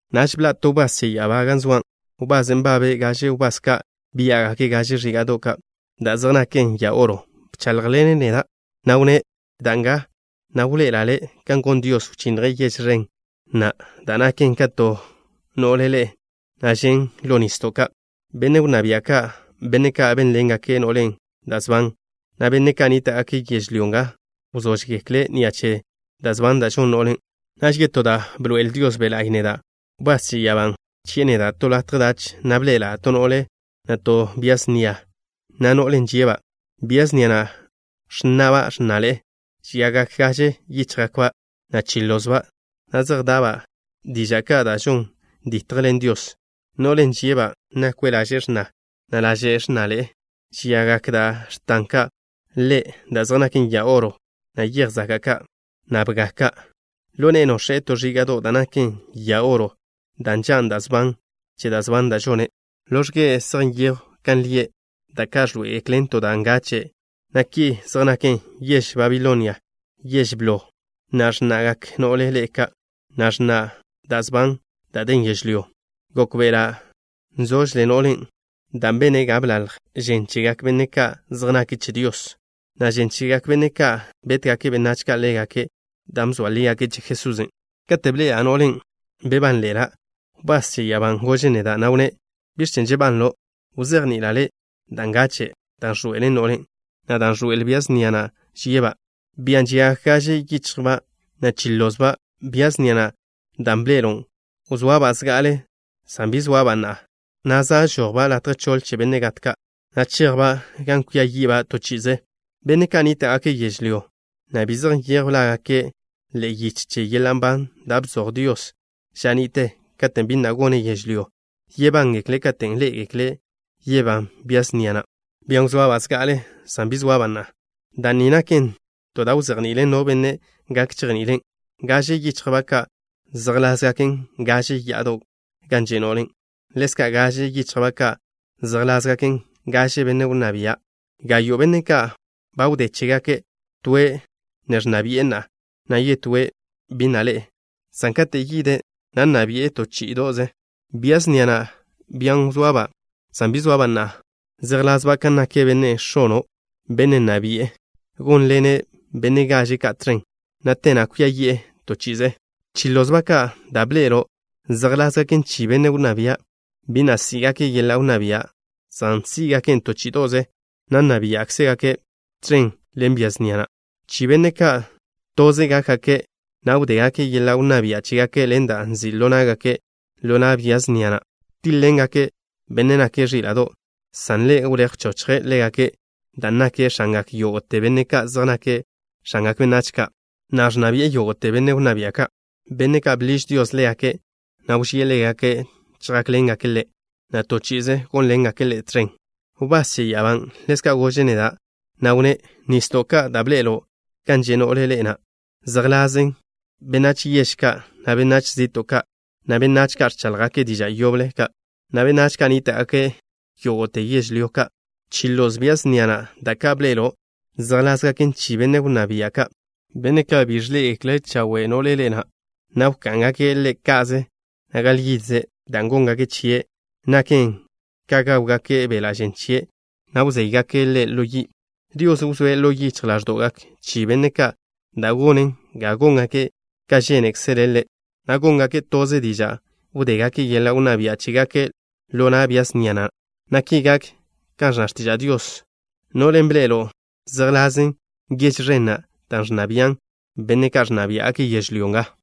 Naž bḻa' to wbás che ya'abá gan zoa', wbasen' nbabe' gaže wbás ka' biá'gake' gaže ẕíga'do' ka' da' zej naken ya oro. Bcháḻjḻene' neda', na' wnné': “Da nga, na' wḻoe'ela' le' kan gon Dios, wchinnje' yež ẕen na' da' naken ka to no'le ḻe'e, na' žen' ḻo nisdo' ka'. Benne' wnná bia' ka', benne' ka' bénḻengake' no'len' da' sban, na' benne' ka' nníta'gake' yežlyó nga, wzóžgekle' ni'a che da' sban da' žon no'len'.” Naž yetó da' bḻoe'el Dios Be' La'y neda'; wbás che ya'abán' bchi'e neda' to latje dach, na' bḻe'ela' to no'le, na' to bia snia, na' no'len' žie'-ba'. Bia snia na' ẕnna'ba' x̱naḻe'e. Žiagak gaže yichjba', na' chi lozba', na' zej da'ba' diža' ka' da' žon dítjgeklen Dios. No'len' žie'-ba' nakwe' laže' x̱na, na' laže' x̱naḻe'e. Žiagak da' x̱tan ka' ḻe' da' zej naken ya oro, na' yej zaka' ka', na' bga ka'. Ḻo ne'e nox̱e' to ẕíga'do' da' naken ya oro, dan' nžan' da' sban che da' sban da' žone'. Ḻo x̱ge' zej nyejw kan lie', da' ka' ẕḻoé'egeklen to da' ngache', na' ki zej naken: “Yež Babilonia, Yež Blo” na' “X̱na'gak No'le Ḻe'e Ka'” na' “X̱na' Da' Sban Da' Den Yežlyó.” Gókbe'ela' nzožle no'len' dan' bene' ga bḻalj žen chegak benne' ka' zej nake' che Dios, na' žen chegak benne' ka' betgak benách ka' ḻégake' dan' bzoa lígake' che Jesusen'. Kate' bḻe'ela' no'len', bebánḻe'ela'. Wbás che ya'abán' gože' neda', na' wnné': “¿Biẕ chen' žebanlo'? Wzejni'ila' le' da' ngache', dan' ẕḻoe'el no'len', na' dan' ẕḻoe'el bia snia na' žie'-ba', bian' žiagak gaže yichjba', na' chi lozba'. Bia snia na' dan' bḻe'elo' wzoaba' zga'ale san bi zoaba' na'a, na' za' žojba' latje choḻ che benne' gat ka', na' chejba' gan kwia yi'ba' to chi'ize. Benne' ka' nníta'gake' yežlyó, na' bi zej nyejw lágake' ḻe'e yiche che yeḻa' nban da' bzoj Dios ža ni'te katen' bi na' gone' yežlyó, yebángekle' katen' ḻé'egekle' yebán bia snia na', bian' wzoaba' zga'ale san bi zoaba' na'a. Da' ni naken to da' wzejni'ilen no benne' gak chejni'ilen': Gaže yichjba' ka' zejḻásgaken gaže ya'ado' gan že' no'len'. Ḻezka', gaže yichjba' ka' zejḻásgaken gaže benne' wnná bia'. Gayo' benne' ka' ba wdé chégake'. Toe' ne ẕnna bi'e na'a, na' yetóe' bi na' ḻe'e, san kate' yide', na' nna bi'e to chí'ido'ze. Bia snia na', bian' wzoaba' san bi zoaba' na'a, zejḻasba' kan nak benne' x̱ono', benne' nna bi'e. Gónḻene' benne' gaže ka' tẕen, na' te na' kwia yi'e to chi'ize. Chi lozba' ka' da' bḻe'elo' zejḻásgaken chi benne' wnná bia'. Bi na' sí'gake' yeḻa' wnná bia', san sí'gaken' to chí'ido'ze, na' nna biá'gake' tẕen ḻen bia snia na'. Chi benne' ka', toze gákgake', na' wdégake' yeḻa' wnná bia' chégake' ḻen da' nzi' ḻo ná'gake', ḻo na' bia snia na'. Tíḻ-ḻengake' Bennen' nake' Ẕíla'do', san Ḻe' wléj wchochje' ḻégake' dan' nake' X̱angak yógo'te benne' ka' zej nake' x̱angak benách ka', na' ẕnna bi'e yógo'te benne' wnná bia' ka'. Benne' ka' bḻiž Dios ḻégake', na' wžíe' ḻégake', chjákḻengake' Ḻe', na' to chi'ize gónḻengake' Ḻe' tẕen.” Wbás che ya'abán' ḻezka' gože' neda', na' wnné': “Nisdo' ka' da' bḻe'elo' gan že' no'le ḻe'e na', zejḻásgaken benách yež ka', na' benách zi'to' ka', na' benách ka' ẕcháḻjgake' diža' yoble ka', na' benách ka' nníta'gake' yógo'te yežlyó ka'. Chi loz bia snia na' da' ka' bḻe'elo' zejḻásgaken chi benne' wnná bia' ka', benne' ka' bi dégake' chawe' no'le ḻe'e na', na' wká'ngake' ḻe' ka'ze, na' gal yidze'. Da' góngake' chie' naken ka gáwgake' beḻa' žen chie', na' wzéygake' ḻe' ḻo yi'. Dios wzóe' ḻo yichj ḻáẕdo'gak chi benne' ka' da' gonen ga góngake' ka žénekzele' Ḻe', na' góngake' toze diža' wdégake' yeḻa' wnná bia' chégake' ḻo na' bia snia na', na ki gak kan ẕnna x̱tiža' Dios. No'len' bḻe'elo' zejḻase' yež ẕen na' da' ẕnna bian' benne' ka' ẕnna biá'gake' yežlyó nga.”